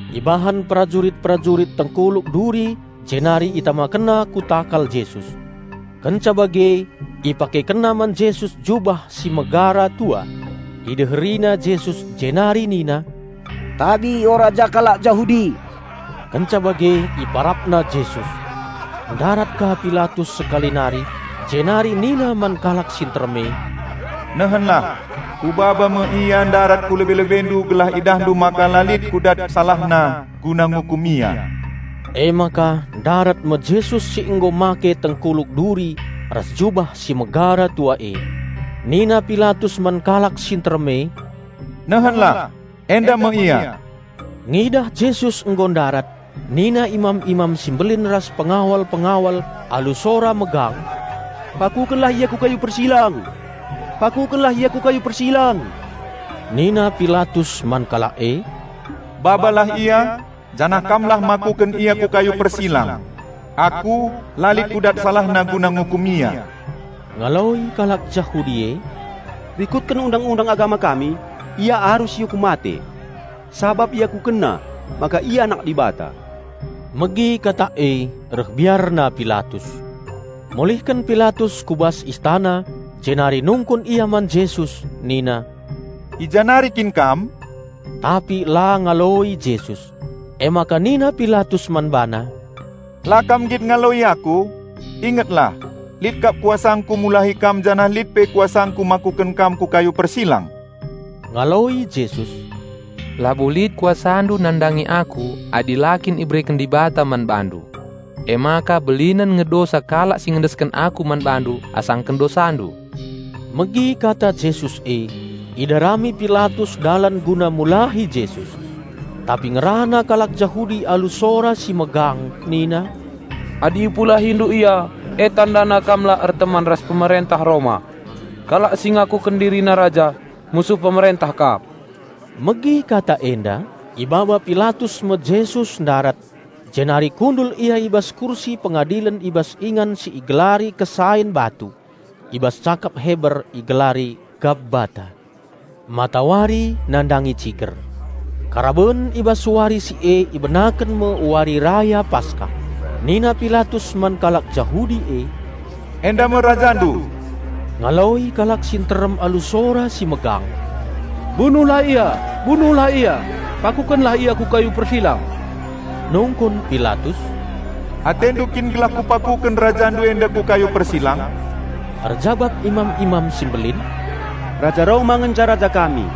Ibahan perajurit-perajurit tengkuluk duri jenari itamakenna ku takal Jesus. Kenca bage ipakekenna man Jesus jubah si megara tua. Ideherina Jesus jenari nina, "Tabi, o Raja kalak Jahudi!" Kenca bage iparapna Jesus. Ndarat ka Pilatus sekali nari, jenari nina man kalak si nterem e, "Nehenlah, kubaba me Ia ndarat ku lebe-lebendu gelah idahndu maka la lit kudat SalahNa guna ngukum Ia." Emaka ndarat me Jesus si nggo make tengkuluk duri ras jubah si megara tua e. Nina Pilatus man kalak si nterem e, "Nehenlah! Enda me Ia!" Ngidah Jesus nggo ndarat nina imam-imam si mbelin ras pengawal-pengawal alu sora megang, "Pakukenlah Ia ku kayu persilang! Pakukenlah Ia ku kayu persilang!" Nina Pilatus man kalak e, "Babalah Ia, janah kamlah makuken Ia ku kayu persilang. Aku, la lit kudat salahna guna ngukum Ia." Ngaloi kalak Jahudi e, "Rikutken Undang-undang agama kami Ia arus iukum mate, sabap IakukenNa maka Ia Anak Dibata." Megi kata e reh biarna Pilatus. Mulihken Pilatus ku bas istana jenari nungkun ia man Jesus nina, "I ja nari kin Kam?" Tapi la ngaloi Jesus. Emaka nina Pilatus man BaNa, "La kam nggit ngaloi aku? Ingetlah! Lit kap kuasangku mulahi Kam janah lit pe kuasangku makuken Kam ku kayu persilang!" Ngaloi Jesus, "Labo lit kuasandu nandangi Aku adi la kin ibereken Dibata man bandu. Emaka belinen nge dosa kalak si ngendesken Aku man bandu asangken dosandu!" Megi kata Jesus e, idarami Pilatus dalan guna mulahi Jesus. Tapi ngerana kalak Jahudi alu sora si megang nina, "Adi ipulahindu Ia, e tandana kam la erteman ras pemerentah Roma! Kalak si ngakuken dirina raja, musuh pemerentah kap." Megi kata enda, ibaba Pilatus me Jesus ndarat, jenari kundul Ia i bas kursi pengadilen i bas ingan si igelari Kesain Batu (I bas cakap Heber igelari: Gabbata.) Matawari nandangi ciger. Karaben i bas wari si e ibenaken me Wari Raya Paskah. Nina Pilatus man kalak Jahudi e, "Enda me Rajandu!" Ngaloi kalak si nterem alu sora si megang, "Bunuhlah Ia! Bunuhlah Ia! Pakukenlah Ia ku kayu persilang!" Nungkun Pilatus, "Atendu kin gelah kupakuken Rajandu enda ku kayu persilang?" Erjabap imam-imam si mbelin, "Raja Roma ngenca raja kami."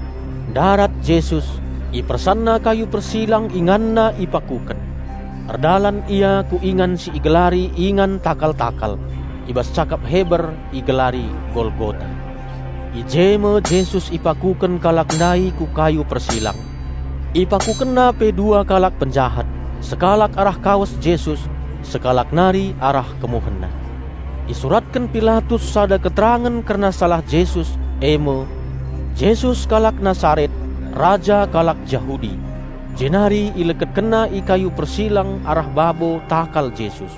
Ndarat Jesus, IpersanNa kayu persilang InganNa ipakuken. Erdalan Ia ku ingan si igelari Ingan Takal-takal. (I bas cakap Heber igelari Golgota.) I je me Jesus ipakuken kalak ndai ku kayu persilang. Ipakukenna pe dua kalak penjahat, sekalak arah kawes Jesus, sekalak nari arah KemuhenNa. Isuratken Pilatus sada keterangen kerna salah Jesus e me, "Jesus kalak Nasaret, Raja kalak Jahudi," jenari ileketkenna i kayu persilang arah babo takal Jesus.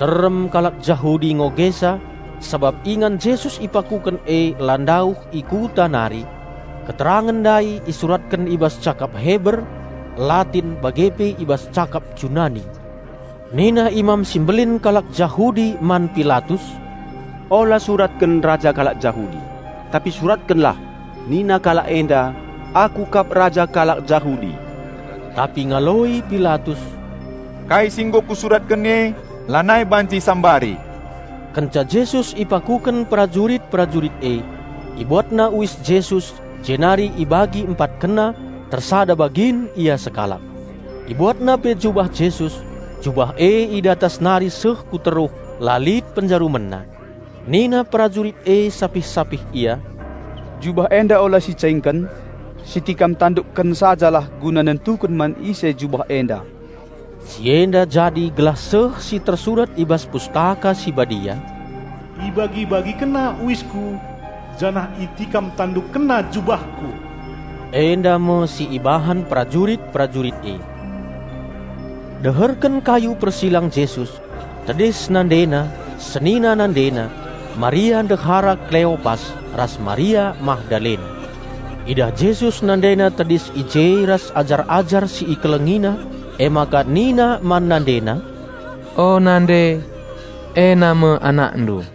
Nterem kalak Jahudi ngogesa, sabap ingan Jesus ipakuken e la ndauh i kuta nari. Keterangen ndai isuratken i bas cakap Heber, Latin bage pe i bas cakap Junani. Nina Imam si Mbelin kalak Jahudi man Pilatus, "Ola suratken: Raja kalak Jahudi, tapi suratkenlah, 'Nina kalak enda: Aku kap Raja kalak Jahudi.'" Tapi ngaloi Pilatus, "Kai si nggo kusuratken e, lanai banci isambari!" Kenca Jesus ipakuken perajurit-perajurit e, ibuatna uis Jesus jenari ibagi empatkenna, tersada bagin ia sekalak. Ibuatna pe jubah Jesus, jubah e i datas nari seh ku teruh la lit penjarumenna. Nina perajurit e sapih-sapih ia, "Jubah enda ola sicaingken. Sitikam tandukken sajalah guna nentuken man ise jubah enda." Si enda jadi gelah seh si tersurat i bas Pustaka Si Badia, "Ibagi-bagikenna uisKu, janah itikam tandukkenna jubahKu." Enda me si ibahan perajurit-perajurit e. Deherken kayu persilang Jesus, tedis NandeNa, senina NandeNa, Maria ndehara Kleopas ras Maria Magdalena. Idah Jesus NandeNa tedis i je ras ajar-ajar si IkelengiNa, emaka Nina man NandeNa, "O nande, ena me anakndu."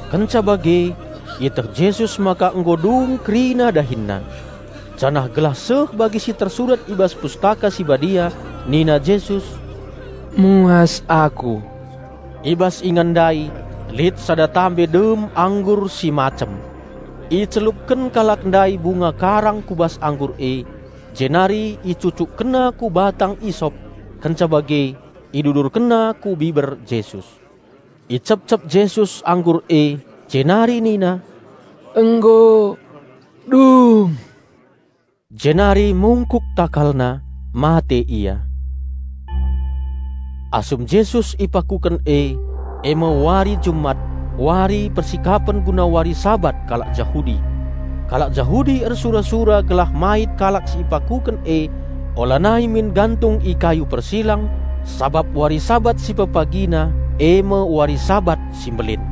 Kenca bage ieteh Jesus maka nggo dung kerina DahinNa. Janah gelah seh bagi si tersurat i bas Pustaka Si Badia nina Jesus, "Muas Aku." I bas ingan ndai lit sada guci dem anggur si macem. Icelupken kalak ndai bunga karang ku bas anggur e, jenari icucukkenna ku batang isop, kenca bage idudurkenna ku biber Jesus. Icepcep Jesus anggur e, jenari nina, "Nggo dung!" Jenari mungkuk TakalNa, mate Ia. Asum Jesus ipakuken e, e me wari Jumat, wari persikapen guna wari Sabat kalak Jahudi. Kalak Jahudi ersura-sura gelah mait kalak si ipakuken e ulanai min gantung i kayu persilang, sabap wari Sabat si pepagina, e me wari Sabat si Mbelin.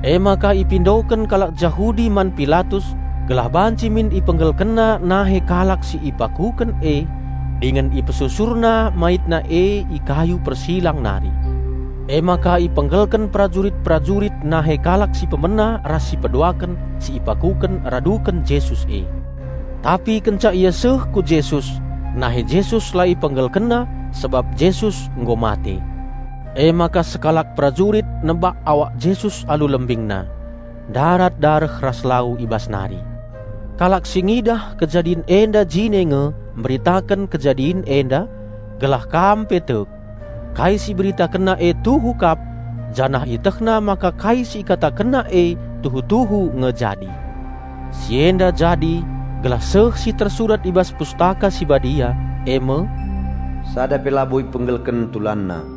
Emaka ipindoken kalak Jahudi man Pilatus gelah banci min ipenggelkenna nahe kalak si ipakuken e dingen ipesusurna maitna e i kayu persilang nari. Emaka ipenggelken perajurit-perajurit nahe kalak si pemena ras si peduaken si ipakuken raduken Jesus e. Tapi kenca ia seh ku Jesus nahe Jesus la ipenggelkenna sabap Jesus nggo mate. Emaka sekalak perajurit nebak awak Jesus alu lembingna; ndarat dareh ras lalu i bas nari. (Kalak si ngidah kejadin enda jine nge meritaken kejadin enda, gelah kam pe tek. Kai si iberitakenna e tuhu kap, janah ietehna maka kai si ikatakenna e tuhu-tuhu nge jadi.) Si enda jadi gelah seh si tersurat i bas Pustaka Si Badia, e me "Sada pe labo ipenggelken TulanNa."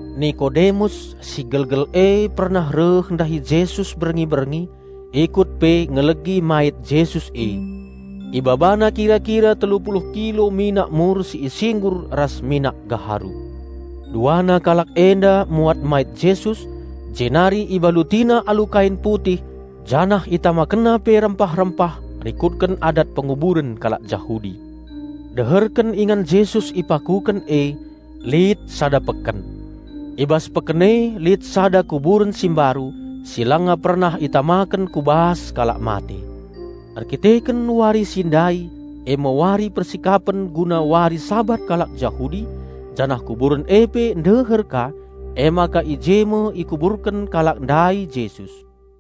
Nikodemus si gelgel e pernah reh ndahi Jesus berngi-berngi, ikut pe ngelegi mait Jesus e. Ibabana kira-kira telu puluh kilo minak mur si isinggur ras minak gaharu. Duana kalak enda muat mait Jesus, jenari ibalutina alu kain putih janah itamakenna pe rempah-rempah rikutken adat penguburen kalak Jahudi. Deherken ingan Jesus ipakuken e, lit sada peken. I bas peken e lit sada kuburen si mbaru, si langa pernah itamaken ku bas kalak mate. Erdandanken wari si ndai e me wari persikapen guna wari Sabat kalak Jahudi, janah kuburen e pe ndeher ka, emaka i je me ikuburken kalak ndai Jesus.